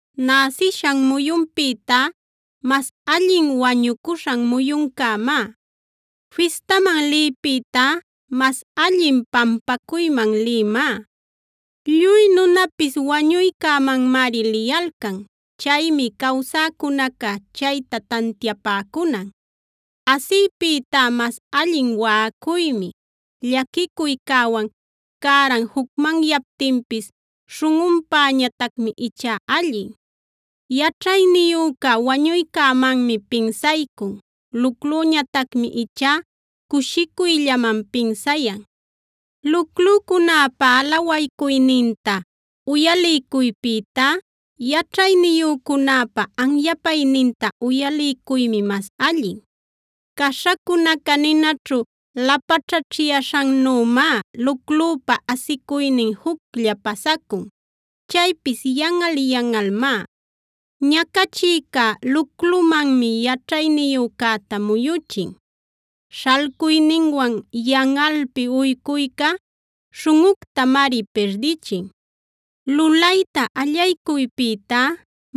Näsishan muyunpïtá mas allin wañucuśhan muyuncämá. Fistaman liypïtá mas allin pampacuyman liymá. Lluy nunapis wañuycämanmari liyalcan; chaymi cawsäcunaca chayta tantiapäcunan. Asiypïtá mas allin waꞌacuymi; llaquicuycäwan cäran jucmanyaptinpis śhunꞌunpäñatacmi ichá allin. Yaćhayniyüca wañuycämanmi pinsaycun; luclüñatacmi ichá cushicuyllaman pinsayan. Luclucunäpa alawaycuyninta uyaliycuypïtá yaćhayniyücunäpa anyapayninta uyaliycuymi mas allin. Caśhacunaca ninaćhu lapaćhaćhyaśhannümá luclüpa asicuynin juclla pasacun; chaypis yanꞌal-yanꞌalmá. Ñacachïca luclumanmi yaćhayniyücäta muyuchin; śhalcuyninwan yanꞌalpi uycuyca śhunꞌuctamari pirdichin. Lulayta allaycuypïtá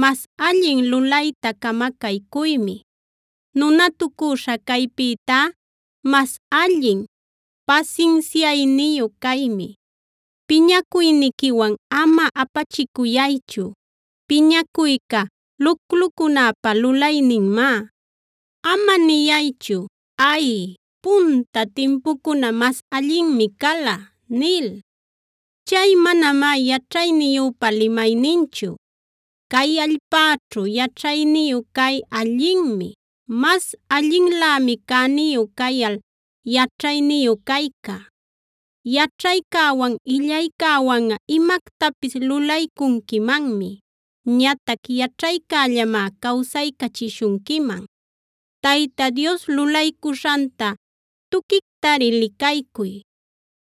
mas allin lulayta camacaycuymi; nunatucüśha caypïtá mas allin pasinsiayniyu caymi. Piñacuyniquiwan ama apachicuyaychu;b piñacuyca luclucunäpa lulayninmá. Ama niyaychu: “Ay, punta timpucuna mas allinmi cala” nil; chay manamá yaćhayniyüpa limayninchu. Cay allpäćhu yaćhayniyu cay allinmi; mas allinlämi cäniyu cayal yaćhayniyu cayca. Yaćhaycäwan, illaycäwanꞌa imactapis lulaycunquimanmi; ñatac yaćhaycällamá cawsaycachishunquiman. Tayta Dios lulaycuśhanta tuquictari licaycuy;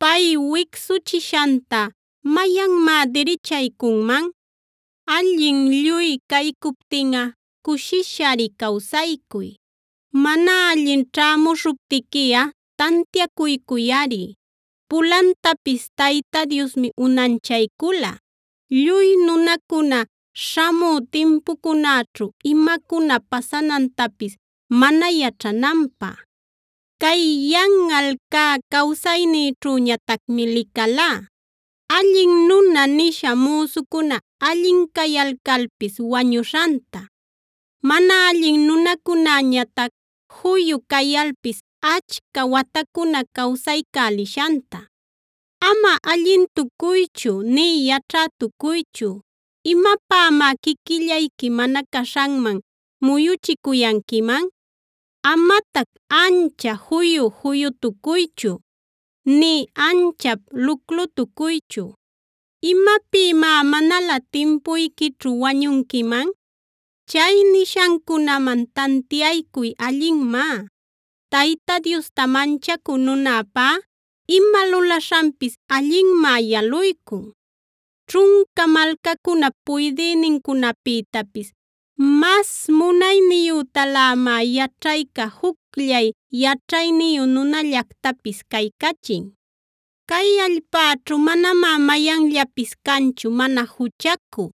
pay wicsuchishanta ¿mayanmá dirichaycunman? Allin lluy caycuptinꞌa cushishari cawsaycuy; mana allin ćhämuśhuptiquiꞌa tantiacuycuyꞌari. Pulantapis Tayta Diosmi unanchaycula lluy nunacuna śhamü timpucunäćhu imacuna pasanantapis mana yaćhananpä. Cay yanꞌal cä cawsaynïćhüñatacmi licalá: Allin nuna nisha müsucuna allin cayalcalpis wañuśhanta; mana allin nunacunäñatac juyu cayalpis achca watacuna cawsaycälishanta. Ama allintucuychu nï yaćhätucuychu. ¿Imapämá quiquillayqui mana caśhanman muyuchicuyanquiman? Amatac ancha juyu-juyutucuychu, nï anchap luclutucuychu. ¿Imapïmá manalä timpuyquićhu wañunquiman? Chay nishancunaman tantiaycuy allinmá. Tayta Diosta manchacü nunäpá ima lulaśhanpis allinmá yaluycun. Ćhunca malcacunap puydïnincunapïtapis mas munayniyütalamá yaćhayca jucllay yaćhayniyu nunallactapis caycachin. Cay allpäćhu manamá mayanllapis canchu mana juchacü,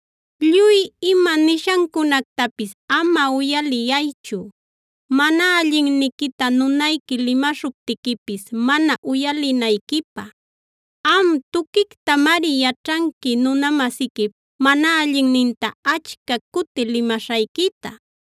Lluy ima nishancunactapis ama uyaliyaychu, mana allinniquita nunayqui limaśhuptiquipis mana uyalinayquipä. Am, tuquictamari yaćhanqui nuna-masiquip mana allinninta achca cuti limaśhayquita.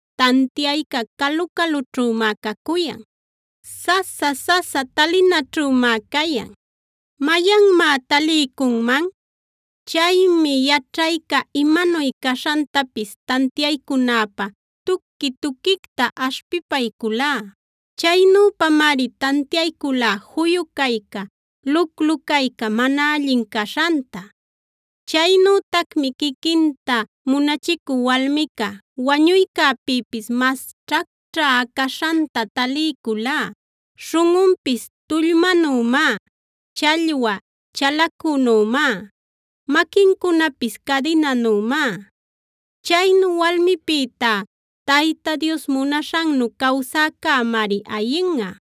Tantiayca calu-calućhümá cacuyan; sasa-sasa talinaćhümá cayan. ¿Mayanmá taliycunman? Chaymi yaćhayca imanuy caśhantapis tantiaycunäpä tuqui-tuquicta aśhpipayculá. Chaynüpamari tantiayculá juyu cayca, luclu cayca mana allin caśhanta. Chaynütacmi quiquinta munachicü walmica wañuycäpïpis mas ćhacćhä caśhanta taliyculá; śhunꞌunpis tullmänümá, challwa chalacunümá, maquincunapis cadinanümá. Chaynu walmipïtá Tayta Dios munaśhannu cawsäcämari ayinꞌa;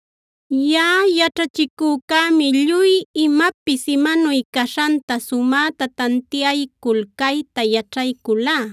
Yaꞌa yaćhachicücämi lluy imapis imanuy caśhanta sumäta tantiaycul cayta yaćhayculá: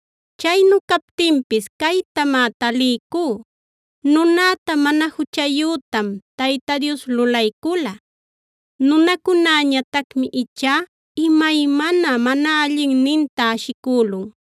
Chaynu captinpis caytamá taliycú: Nunäta mana juchayütam Tayta Dios lulaycula;e nunacunäñatacmi ichá imaymana mana allinninta ashicülun.